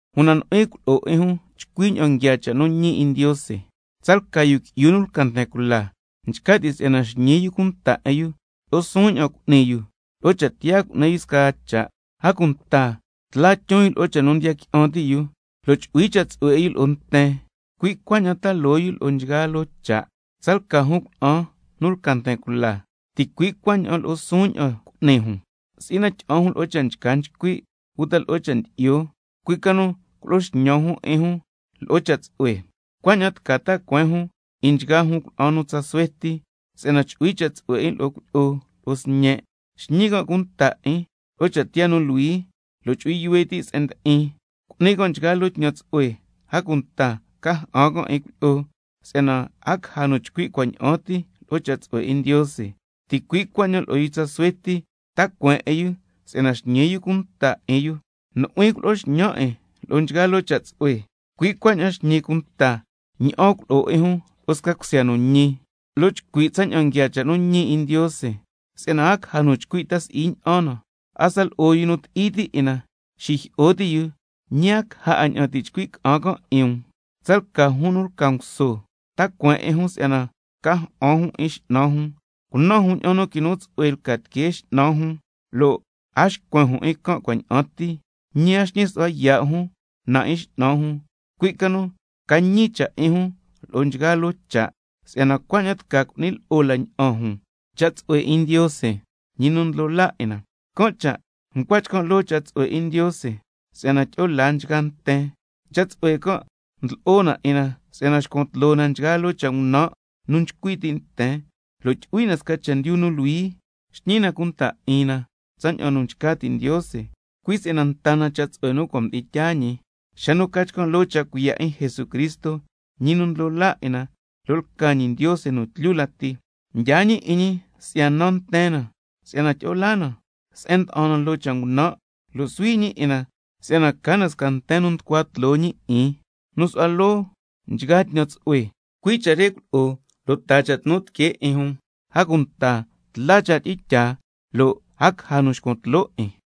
Una nu'huin ntsu'hui cha' culo'o 'in jun chcui ña'an nguiaa cha' nu ñi 'in Ndiose. Tsalca yu qui'yu nu lca nten cula, nchca ti' si'yana xñi yu cunta 'in yu, lo'o suun ña'an cu'ni yu, lo'o cha' tiyaa cu'ni yu scaa cha', a cunta tla tyon yu lo'o cha' nu ndiya qui'an ti' yu, lo' chu'hui cha' tsu'hue 'in yu lo'o nten, cui' cuaña'an ta loo yu lo'o nchgaa loo cha'. Tsalca jun cuna'an nu lca nten cula, ticui' cuaña'an lo'o suun ña'an cu'ni jun, si'i na tyi'an jun lo'o cha' nchca nchcui' uta lo'o cha' ndyi'yo, cui' ca nu culo'o xñan jun 'in jun lo'o cha' tsu'hue, cuaña'an tca ta cueen jun 'in nchgaa jun cuna'an nu tsa suhue ti nu ndi'in cuilyi'o, si'yana chu'hui cha' tsu'hue 'in lo'o cuilyi'o lo'o sñe', xñi can' cunta 'in lo'o cha' tiyaa nu luhui, lo' chu'hui yuhue ti' se'en ndi'in, cu'ni can' nchgaa loo tñan tsu'hue, a cunta ca ja'an can' 'in cuilyi'o, si'yana a caja nu chcui' cua' ña'an ti lo'o cha' tsu'hue 'in Ndiose. Ticui' cuaña'an lo'o yu tsa suhue ti, ta cueen 'in yu si'yana xñi yu cunta 'in yu. Nu'huin culo'o xñan 'in lo'o nchgaa loo cha' tsu'hue, cui' cuaña'an xñi cunta ña'an culo'o 'in jun lo'o sca cusya nu ñi, lo' chcui' tsaña'an nguiaa cha' nu ñi 'in Ndiose, si'yana a caja nu chcui' ta si'i ña'an na, hasta lo'o yu nu ti'i ti' 'in na xijyi'o ti' yu, ñi a caja 'a ña'an ti' chcui' ca'an can' 'in um. Tsalca jun nu lca nguso, ta cueen 'in jun si'yana ca ja'an jun 'in x'nan jun, cunan jun ña'an nu quinu tsu'hue lca tiquee x'nan jun, lo' a xcuen jun 'in can' cua' ña'an ti, ñi a xñi su'hua yaa' jun na 'in x'nan jun, cui' ca nu ca ñi cha' 'in jun lo'o nchgaa loo cha', si'yana cuaña'an tca cu'ni lo'o la ña'an jun cha' tsu'hue 'in Ndiose, Ñi nu ndlo laa 'in na. Can' cha' ncua chcan' loo cha' tsu'hue 'in Ndiose, si'yana tyi'o laa nchgaa nten. Cha' tsu'hue can' ndlo'o na 'in na si'yana xcuan tloo na nchgaa loo cha' ngunan' nu nchcui ti' nten, lo' tyu'hui na sca chendyu nu luhui, xñi na cunta 'in na tsaña'an nu nchca ti' Ndiose, cui' si'yana nta na cha' tsu'hue nu cua' mdi'in tyaa ñi xa nu ca chcan' loo cha' cuiya' 'in Jesucristo, Ñi nu ndlo laa 'in na lo' lca ñi Ndiose nu tlyu lati. Mdyaa ñi 'in ñi si'ya naa nten na, ña'an ca si'yana tyi'o laa na se'en mda'an na loo cha' ngunan', lo' suhui ñi 'in na si'yana ca na sca nten nu tucua tloo ñi 'in, nu su'hua loo nchgaa tñan tsu'hue. Cui' cha' re culo'o lo' taa cha' tnu tiquee 'in jun, a cunta tla cha' tyi'in tyaa, lo' a caja nu xcuan tloo 'in.